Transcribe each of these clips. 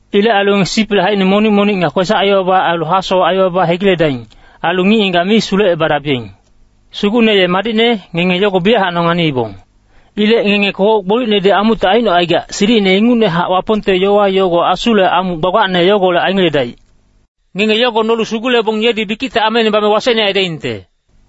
Ilec ailu ngenge sisipilic haicine monic-monic nga kwesac-aibaba ailu hasowac aibaba hegiledaing. Ailu ngic-ngigac mi sulecebadabiyeng. Sugucne ye madicne, ngenge yogo biyachac nonganiibong. Ilec ngenge kogoc gbolicnedi amucte aicnocaigac, silicine ingucnehac Wapongte yowa yogo asule amuc gbagbacne yogolec aingeledaic. Ngenge yogo nolu sugulebong yedi bikicte ameine bame wasecne aidaingte.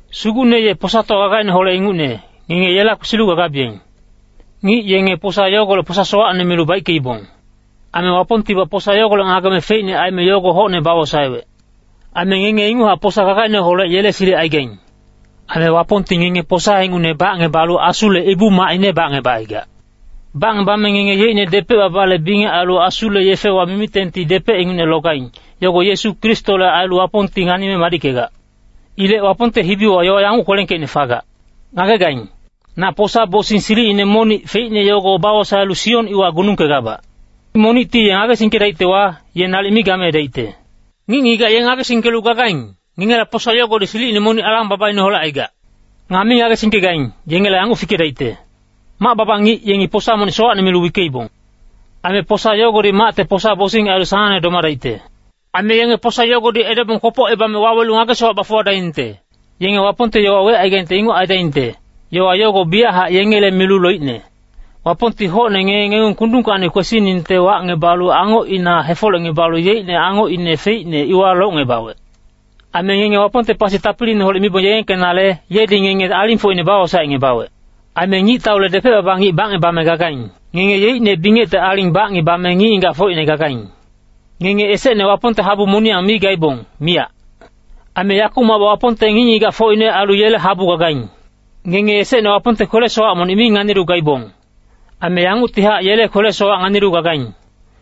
Sugucne ye posatowa gagaineholec ingucne, ngenge yela kwesilu gagabiyeng. Ngic yenge posa yogolec posa sowacne milu baickeibong. Aime Wapongtibac posa yogolec ngageme feicne aime yogo hocne bawosaewec. Aime ngenge inguchac posa gagaineholec yele silic aigaing. Aime Wapongti ngenge posa ingucne bacngebalu asule ibu-macine bacngebacaigac. Bacngebame ngenge yeicne depec-babale bingec ailu Asule yefewa mimitengti depec ingucne logaing, yogo Yesu Kristole ailu Wapongti nganime madickegac. Ilec Wapongte hibiwa yowa yanguc kwelengkeicne fagac, “Ngagegaing, na posa-bosing silicine monic feicne yogo bawosaelu Sion iwa gunungkegabac. Monicti ye ngagesingkedaictewa, ye nalic mi gameedaicte.” Ngic-ngigac ye ngagesingkelu gagaing, ngengela posa yogodi silicine monic alang-babaineholec aigac. Nga mi ngagesingkegaing, yengela yanguc fikedaicte, “Mac-baba ngic yengi posa monic sowacne milu wickeibong. Aime posa yogodi macte posa-bosing ailu sanangne domadaicte.” “Aime yenge posa yogodi edebong kwopocebame wawelu ngage-sowac bafuwadaingte.” Yenge Wapongte yowa wecaigaingte inguc aidaingte, yowa yogo biyachac yengele milu loicne. Wapongti hocne ngenge ngengung kundungkacni kwesiningte wacngebalu angocina hefolecngebalu yeicne angocine feicne, iwa locngebawec. “Aime ngenge Wapongte pasi tapiliineholec mibong yegengkenale, yedi ngenge alingfocine bawosaecngebawec. Aime ngictaule depec-baba ngic bacngebame gagaing. Ngenge yeicne bingecte aling bacngebame ngic-ngigacfocine gagaing.” Ngenge esecne Wapongte habu moniyang mi gaibong, miyac. Aime yakumacbac Wapongte ngic-ngigacfocine ailu yele habu gagaing. Ngenge esecne Wapongte kwele-sowac monic mi nganilu gaibong. Aime yanguctihac yele kwele-sowac nganilu gagaing.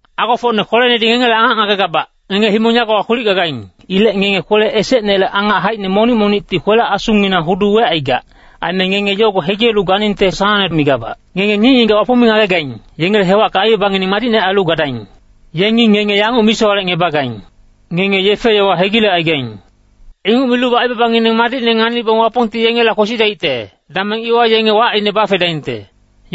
Agofocne kwelenedi ngengele angac ngagegabac, ngenge himong yagowa kwilic gagaing. Ilec ngenge kwele esecnele angac haicine monic-monicti kwele-asunginang hudu wecaigac. Aime ngenge yogo hegilelu ganingte sanangne migabac. Ngenge ngic-ngigac Wapong mi ngagegaing, yengele hewacka aibabangineng madicne ailu gadaing. Yengi ngenge yanguc misowalecngebagaing, “Ngenge yefe-yowa hegilecaigaing.” Inguc milubac aibabangineng madicne nganibong Wapongti yengela kwesidaicte, dameng iwa yenge wacine bafedaingte.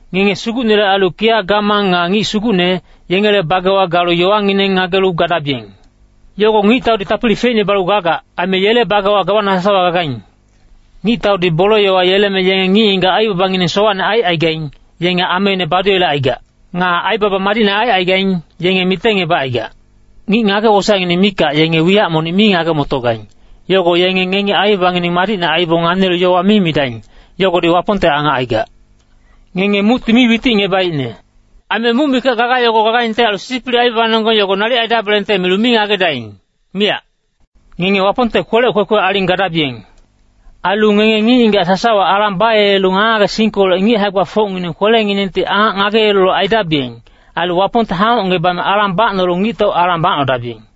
Ngenge Sugucnele ailu kiya gamang nga ngic sugucne, yengele bagewa galu yowangineng ngagelu gadabiyeng. Yogo ngictaudi tapili feicne balu gagac, aime yele bagewa gawana sasawa gagaing. Ngictaudi bole-yowa yeleme yenge ngic-ngigac aibabangineng sowacne aicaigaing, yenge ameine baduyelecaigac. Nga aibaba madicne aicaigaing, yenge mitengebacaigac. Ngic ngage-wosaecngineng mikac yenge wiyac monic mi ngage-motogaing, yogo yenge ngengi aibabangineng madicne aibong nganilu yowa mi midaing, yogodi Wapongte angac aigac. Ngenge mucti mi witicngebaicne. Aime muc mikac gaga yogo gagaingte ailu sisipilic aibabanonggeng nalic aidabelengte milu mi ngagedaing, miyac. Ngenge Wapongte kwelec kwekwe aling gadabiyeng. Ailu ngenge ngic-ngigac sasawa alang bayelelu ngage-ngagesingkolec ngic hae-gbafocngineng kwelenginengti angac ngageyelelu aidabiyeng. Ailu Wapongte hangocngebame alang bacnolu ngictau alang bacnodabiyeng.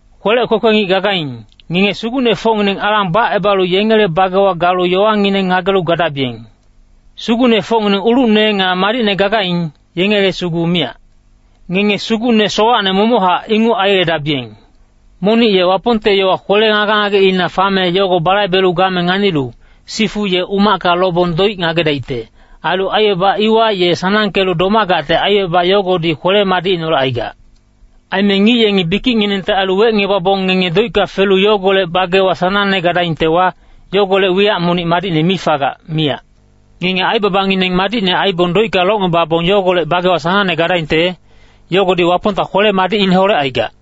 Kwelec kwekwe ngic gagaing, ngenge sugucnefocngineng alang bacebalu yengele bagewa galu yowangineng ngagelu gadabiyeng. Sugucnefocngineng ulucne nga madicne gagaing, yengele sugu miyac. Ngenge sugucne sowacne momochac inguc aiyeledabiyeng. Monic ye Wapongte yowa kwele ngage-ngageina fame yogo balaibelu game nganilu, sifu ye umacka lobong doic ngagedaicte. Ailu aibaba iwa ye sanangkelu domagacte aibaba yogodi kwele-madicineholec aigac. Aime ngic yengi bikicnginengte ailu wecngebabong ngenge doicka felu yogolec bagewa sanangne gadaingtewa, yogolec wiyac monic madicne mi fagac, miyac. Ngenge aibabangineng madicne aibong doicka locngebabong yogolec bagewa sanangne gadaingte, yogodi Wapongta kwele-madicineholec aigac.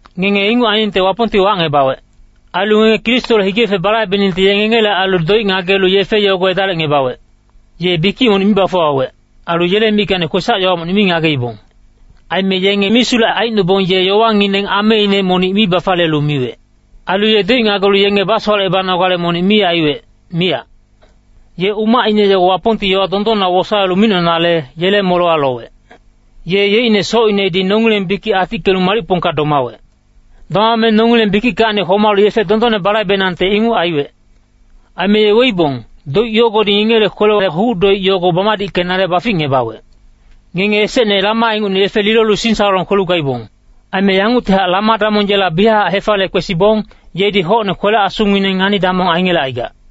Ngenge inguc ainingte Wapongti wacngebawec. Ailu ngenge Kristole hige-yefe balaibeningte ye ngengele ailu doic ngagelu yefe yogo edalicngebawec. “Ye bikic monic mi bafuwawec. Ailu yele mickacni kwesac-yowa monic mi ngageibong.” Aime yenge misulec aicnobong ye yowangineng ameine monic mi bafaliyelu miwec. Ailu ye doic ngagelu yenge basowalecebanogale monic mi aiwec, miyac. Ye umacine yogo Wapongti yowa dondonna wosaelu micnonale, yele molewa lowec. Ye yeicne socinedi nongileng bikic atickelu malicpongka domawec. Domame nongileng bikickacni homalu yefe dondonne balaibenangte inguc aiwec. Aime ye weibong, doic yogodi ngengele kwelele huc-doic yogo bamadickenale baficngebawec. Ngenge esecne lama ingucne yefe lilolu singsalolong kwelu gaibong. Aime yanguctihac Lama-damong yela biyachac hefaliye kwesibong, yedi hocne kwele-asungineng ngani-damong aingelecaigac.